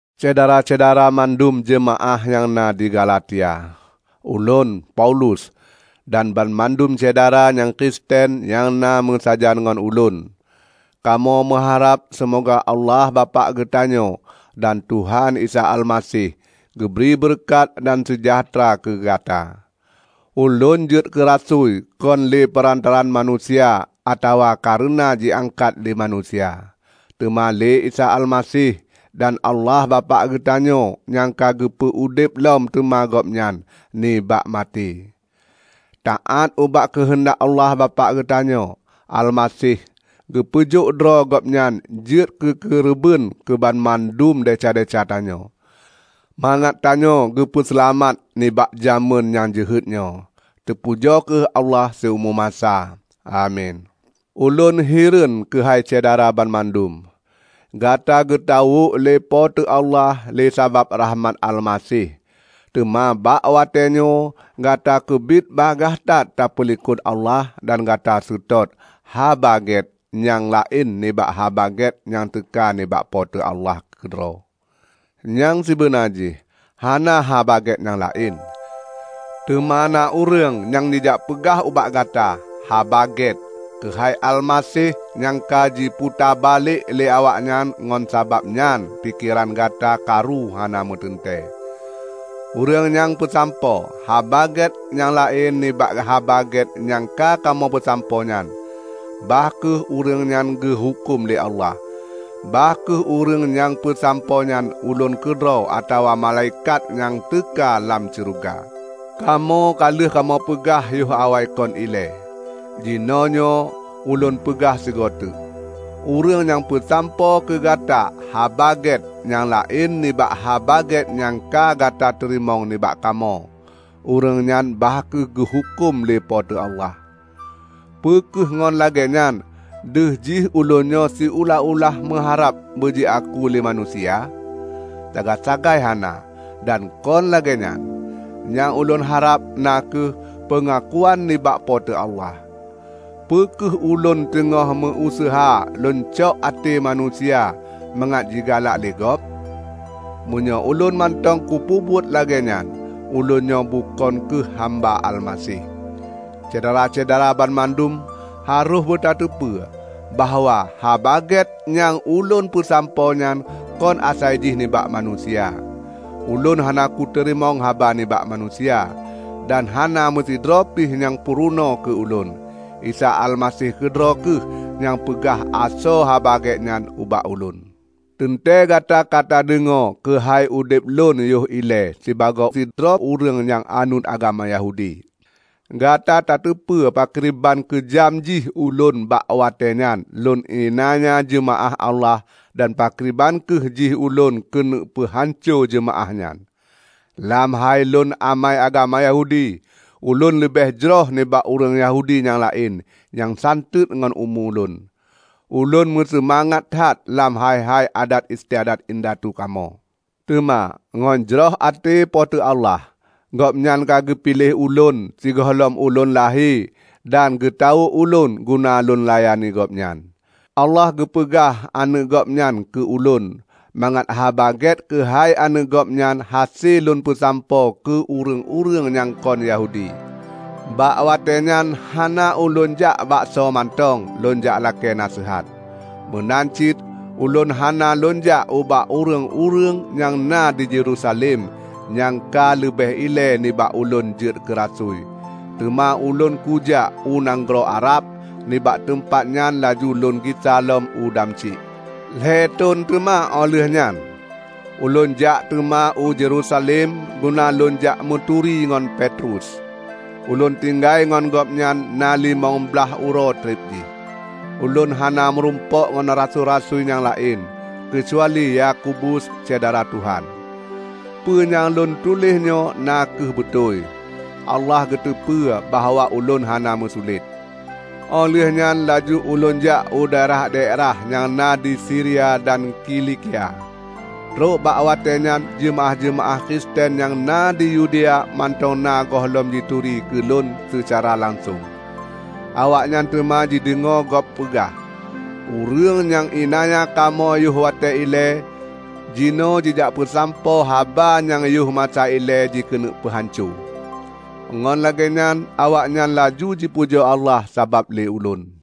Syedara-syedara mandum jeumaáh nyang na di Galatia, Ulôn, Paulus, dan banmandum syedara nyang Kristen nyang na meusajan ngon ulôn, kamoe meuharab seumoga Allah Bapak geutanyoe dan Tuhan Isa Almaseh geubri beureukat dan seujahteura keu gata. Ulôn jeuet keurasui kon lé peurantaraan manusia atawa kareuna jiangkat lé manusia, teuma lé Isa Almaseh dan Allah Bapak geutanyoe nyang ka geupeu udeb lom teuma gobnyan nibak maté. Taát ubak keuheundak Allah Bapak geutanyoe, Almaseh geupeujok droe Gobnyan jeuet keu keureubeuen keubanmandum desya-desya tanyoe, mangat tanyoe geupeu seulamat nibak jamén nyang jeuhet nyoe. Teupujoe kheueh Allah siumu masa! Amin. Ulôn hireuen keuhai Syedara banmandum! Gata geutawök lé Po teu Allah lé sabab rahmat Almaseh, teuma bak watée nyoe gata keubiet bagaih that tapeulikot Allah dan gata seutôt "haba gét" nyang laén nibak Haba Gét nyang teuka nibak Po teu Allah keudroe. Nyang sibeuna jih hana "haba gét nyang laén". Teuma na ureuëng nyang jijakpeugah ubak gata "haba gét" keuhai Almaseh nyang ka jiputa balek lé awaknyan ngon sabab nyan pikeran gata karu hana meuteuntée. Ureuëng nyang peusampoe "haba gét" nyang laén nibak Haba Gét nyang ka kamoe peusampoenyan, bah kheueh ureuëng nyan geuhuköm lé Allah -- bah kheueh ureuëng nyang pesampoe nyan ulôn keudroe atawa malaikat nyang teuka lam syeuruga! Kamoe ka lheueh kamoe peugah yoh awaikon ilée, jinoenyoe ulôn peugah sigoe teuk: Ureuëng nyang peusampoe keu gata "haba gét" nyang laén nibak Haba Gét nyang ka gata teurimong nibak kamoe, ureuëng nyan bah kheueh geuhuköm lé Po teu Allah! Peu kheueh ngon lagée nyan deuh jih ulônnyoe siulah-ulah meuharab beujiaku lé manusia? Sagai-sagai hana dan kon lagée nyan! Nyang ulôn harab na kheueh peungakuan nibak Po teu Allah. Peu kheueh ulôn teungoh meu-useuha lôn cok até manusia mangat jigalak lé gob? Meunyoe ulôn mantong kupeubuet lagée nyan, ulôn nyoe bukon kheueh hamba Almaseh. Syedara-syedara banmandum harôh beutateupeue bahwa Haba Gét nyang ulôn peusampoe nyan kon asai jih nibak manusia. Ulôn hana kuteurimong haba nibak manusia, dan hana meusidroe pih nyang purunoe keu ulôn. Isa Almaseh keudroe kheueh nyang peugah asoe Haba Gét nyan ubak ulôn. Teuntée gata katadeungoe keuhai udeb lôn yoh ilée sibagoe sidroe ureuëng nyang anut agama Yahudi. Gata tateupeue pakriban keujam jih ulôn bak watée nyan lôn iélanya jeumaáh Allah dan pakriban kreueh jih ulôn keuneuk peuhanco jeumaáh nyan. Lam hai lôn amai agama Yahudi, ulôn leubeh jroh nibak ureuëng Yahudi nyang laén nyang santeuet ngon umu ulôn. Ulôn meuseumangat that lam hai-hai adat istiadat indatu kamoe. Teuma ngon jroh até Po teu Allah, Gobnyan ka geupiléh ulôn sigohlom ulôn lahé dan teutawök ulôn guna lôn layani Gobnyan. Allah geupeugah Aneuëk Gobnyan keu ulôn mangat Haba Gét keuhai Aneuëk Gobnyan hase lôn peusampoe keu ureuëng-ureuëng nyang kon Yahudi. Bak watée nyan hana ulôn jak bak soe mantong lôn jak lakée naseuhat. Meunan cit ulôn hana lôn jak ubak ureuëng-ureuëng nyang na di Yerusalem nyang ka leubeh ilée nibak ulôn jeuet keurasui. Teuma ulôn kujak u nanggroe Arab, nibak teumpat nyan laju lôn gisa lom u Damsyik. Lhée thon teuma óh lheueh nyan, ulôn jak teuma u Yerusalem guna lôn jak meuturi ngon Petrus. Ulôn tinggai ngon gobnyan na limong blaih uroe treb jih. Ulôn hana murumpok ngon rasui-rasui nyang laén, keucuali Yakobus, syedara Tuhan. Peue nyang lôn tuléh nyoe na kheueh beutôi. Allah geuteupeue bahwa ulôn hana meusulet! Óh lheueh nyan laju ulôn jak u daerah-daerah nyang na di Siria dan Kilikia. Trok bak watée nyan jeumaáh-jeumaáh Kristen nyang na di Yudea mantong na gohlom jituri keulôn seucara langsong. Awaknyan teuma jideungoe gob peugah, "Ureuëng nyang iélanya kamoe yoh watée ilée, jinoe jijak peusampoe haba nyang yoh masa ilée jikeuneuk peuhanco." Ngon lagée nyan awaknyan laju jipujoe Allah sabab lé ulôn.